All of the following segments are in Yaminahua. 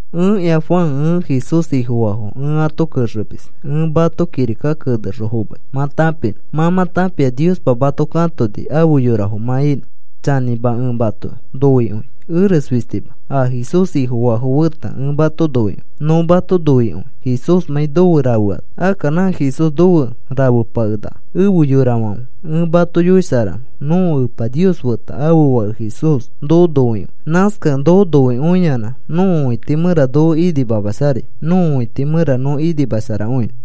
Ẽkĩa Juan, ẽ Jesús Ifofaafo ẽ ato kexemis ẽ mato kirika kenexõ fomai mã tãpinõ. Mã mã tãpia Niospa mato katoni afe yorafo mã inõ. Chanĩma, ẽ mato noikõi, eres fistima, a Jesús Ifofaafo feta ẽ mato noikõi. Nõ mato noikõi Jesúsmãi nofe rafeano. Akka nã Jesús nofe rafepakenaka. Efe yorafãfe, ẽ mato yoisharanõ. Nõko Epa Nios feta ãfe Fake Jesús noko noikõi. Nãskakẽ noko noikõiyanã nõko õiti mẽra noko inimamasharai, nõko õiti mẽra nõ inimasharakõinõ.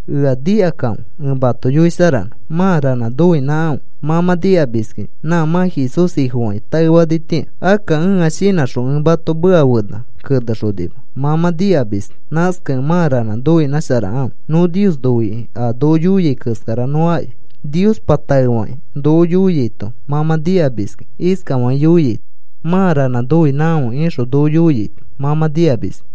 Ea nikakãfe ẽ mato yoisharanõ, mã ranã noinãkãfe. Mã mã nikamiskĩ nã mã Jesús Ifofakĩ taefanitĩa. Akka ẽa shinãxõ ẽ mato meka fena kenexonima, mã mã nikamis. Nãskakẽ mã ranã noinãsharakãfe. Nõ Nios noikĩ a noko yoiai keskara nõ aki. Niospa taefakĩ noko yoiaito mã mã nikamiskĩ iskafakĩ yoiaito: “Mãa ranã noinãkãfe,” ixõ noko yoiaito mã mã nikamis.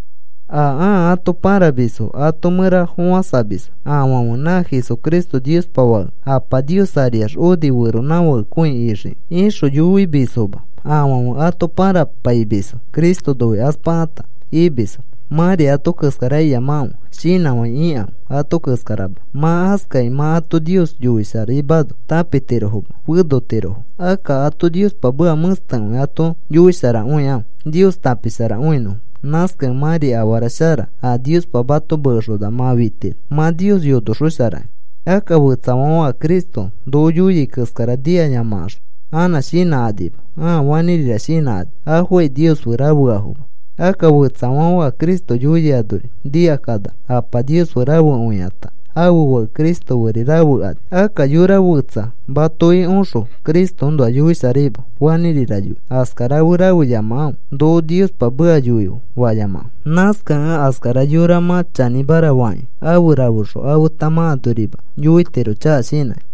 A ãa ato pãramisfo ato mẽra fofãsamisfo. Afãfe, “Na Jesucristo Niospa Fake Apa Nios ariax oni feronãfakekõi ixikĩ,” ixõ yoimisfoma. Afãfe ato pãrapaimisfo Cristo noikaspakata imisfo. Mãri ato keskara iyamakãfe. Shinãfai ikãfe ato keskarama. Mã askakĩ mã ato Nios yoisharaimano tãpitirofoma, fenotirofo. Akka ato Niospa meka mẽstekõi ato yoisharakõikãfe Nios tãpisharakõinõfo. Nãskakẽ mãri afara shara a Niospa mato mekexona mã fitiro, mã Nios yonoxosharakĩ. Akka fetsafãfe a Cristo noko yoiai keskara nikayamakaxõ anã shinãkanima, ãa fanĩrira shinãkani. Afokai Nios fe rafeafoma. Akka fetsafãfe a Cristo yoiai anori nikakanax Apa Nios fe rafekõikata ãfe Fake Cristo feri rafekani. Akka yora fetsa matoki oxõ Cristoõnoa yoisharaima fanĩrira yoi, askara fe rafeyamakãfe. “Noko Niospa meka yoife,” fayamakãfe. Nãskakẽ askara yora mã chanĩmara fakĩ afe rafexõ afeta mã anorima yoitiro chaka shinãkĩ.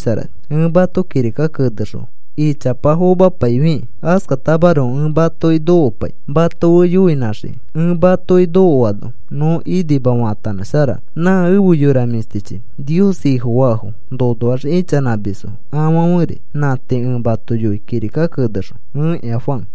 Ẽ mato kirika kenexõ ichapa fomapaifikĩ askatamaroko ẽ matoki nokopai mato fe yoinãxiki. Ẽ matoki nokoano nõ inima faatanãsharanõ. Nã efe yora mĩshtichi, Nios Ifofafo nonoax ichanãmisfo afãferi. Nã tii ẽ mato yoi kirika kenexõ. Ẽkĩa Juan